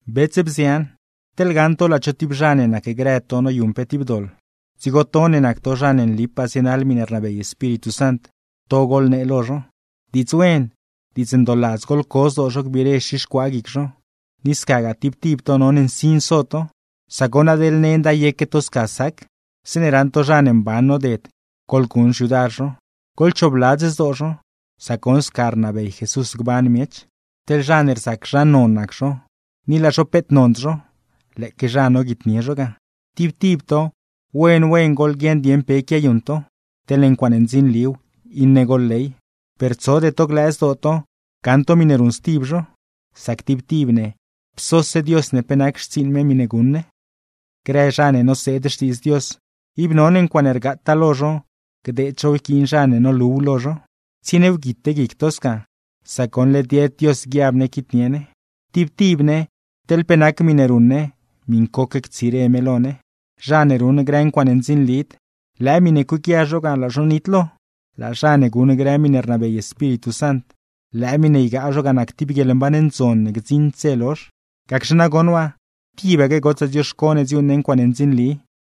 Bets, bzian, teḻne gaṉ to laa cho tib zha ne nacgrë to noyuṉ pe tib doḻ, dzigo to ne nac to zha ne nlipaa zienaḻ miṉe rnabey Espíritu Sant, to goḻnee lo zho. Diidz wen, diidz ndooladz goḻco zdoo zho gbiire xixcuaa guic zho; ni scagaa tib tib to none nsin so to, sac goṉ adeḻ nenda yeque to sca sac. Zeeṉe raṉ to zha ne mban noded, goḻguṉ xyudar zho, goḻchoobladz zdoo zho, sac goṉ sca rnabey Jesús gban miech. Teḻ zha ne rzac zha non nac zho, ni laa zho peet nond zho; lëëque zha noguitnie zho ga. Tib tib to, wen wen goḻguieṉ dieṉ pe quiayuṉ to, teḻne ncuaaṉe ndzinliw iṉe goḻley, per tsode to glëë zdoo to gaṉ to miṉe ruṉ stib zho. Sac tib tib ne, psose Dios ne pe nac xtsiiṉ me miṉe guṉ ne. Grë zha ne noseed Xtiidz Dios, ib none ncuaaṉe rgaataa lo zho gdeed zhow yquiin zha ne noluw lo zho. Tsienie wguite guic to sca, sac goṉ led yed Dios guiab ne quitnie ne. Tib tib ne, teḻ pe nac miṉe ruṉ ne miṉcoque ctsire me lo ne. Zha ne ruṉ grë ncuaaṉe ndzinlid, lëë miṉe cueequia zho ga laa zho nitlo. Laa zha ne guṉ grë miṉe rnabey Espíritu Sant, lëë miṉe ygaa zho ga nac tib guieḻmban ndzon ne gdziṉd dze lozh. Gacxe nagoṉ waa, tibaque gotsaa dzioxco ne dziuuṉ ne ncuaaṉe ndzinli,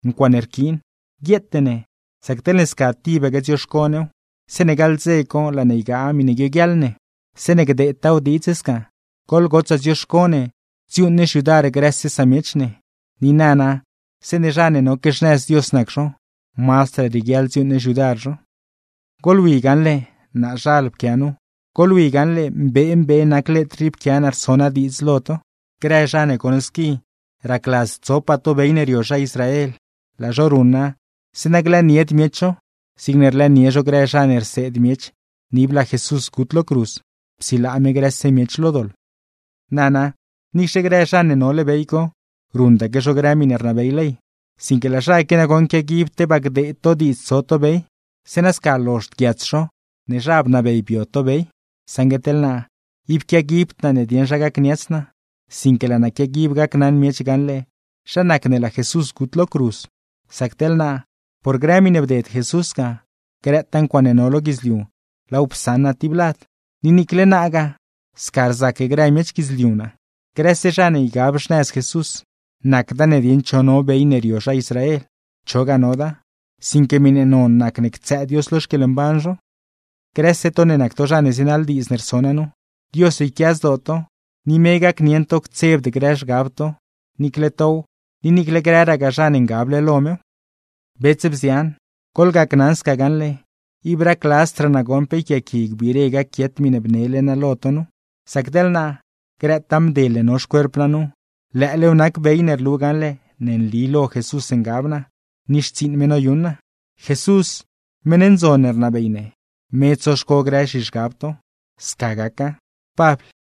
ncuaaṉe rquiin, guieete ne; sac teḻne sca tibaque dzioxco new, zeeṉe gaḻ dze co laa ne ygaa miṉe guioguiaḻ ne. Zeeṉe gdeedtaaw diidz sca, goḻgotsaa dzioxco ne dziuuṉ ne xyudar grëse samiech ne, ni nana zeeṉe zha ne noque xnëz Dios nac zho, mazdraa rieguiaḻ dziuuṉ ne xyudar zho. ¡Goḻwi gaṉle, naazhal pquia nu! ¡Goḻwi gaṉle mbee mbee nac letr rii pquia naa rso naa diidz lo to! Grë zha ne goṉ squi racladz tsopaa to bey ne rio zha Israel, laa zho ruṉa zeeṉa glëënied miech zho, zigne rlëënie zho grë zha ne rseed miech ne ib laa Jesús gut lo cruz, psilaa me grëse miech lo doḻ. Nana, niicxe grë zha ne nole bey co, ruṉdaque zho grë miṉe rnabey ley; sinque laa zha qui nagoṉ quiaguib tebaa gdeed to diidz tso to bey, zeeṉa sca lozhd guiats zho ne zha bnabey to bio to bey. Saṉgue teḻ naa, ib quiaguibd naa ne dieṉ zha gacniats naa, sinque laa naa quiaguib gacnaṉ miech gaṉle zha nac ne laa Jesús gut lo cruz. Sac teḻ naa, por grë miṉe bded Jesús ga, grëtaa ncuaaṉe no lo guidzliu laaw psaṉ naa tib lad; ni niicle naagaa, sca rzac grë miech guidzliu naa. Grëse zha ne ygab xnëz Jesús, nacda ne dieṉ cho no bey ne rio zha Israel, chogaa noda; sinque miṉe non nacne ctsëë Dios lo xquieḻmban zho. Grëse to ne nac to zha ne zienaḻ diidz ne rso naa nu, Dios yquia zdoo to, ni me gacnieṉ to ctsebd grë zhgab to; niicle tow ni niicle grëragaa zha ne ngable lo mew. Bets, bzian, goḻgacnaṉ sca gaṉle, ib racladzdraa naa goṉ pe yquiaaqui gbiire gaquiet miṉe bnele naa lo to nu; sac teḻ naa, grëtaa mdel ne no xcuerp naa nu, lëëlew nac bey ne rlu gaṉle ne nli lo Jesús ngab naa, ni xtsiiṉ me noyuṉ naa. Jesús meṉ ndzon ne rnabey ne, me tsoxco grë zhizhgab to. Sca gaca. Pabl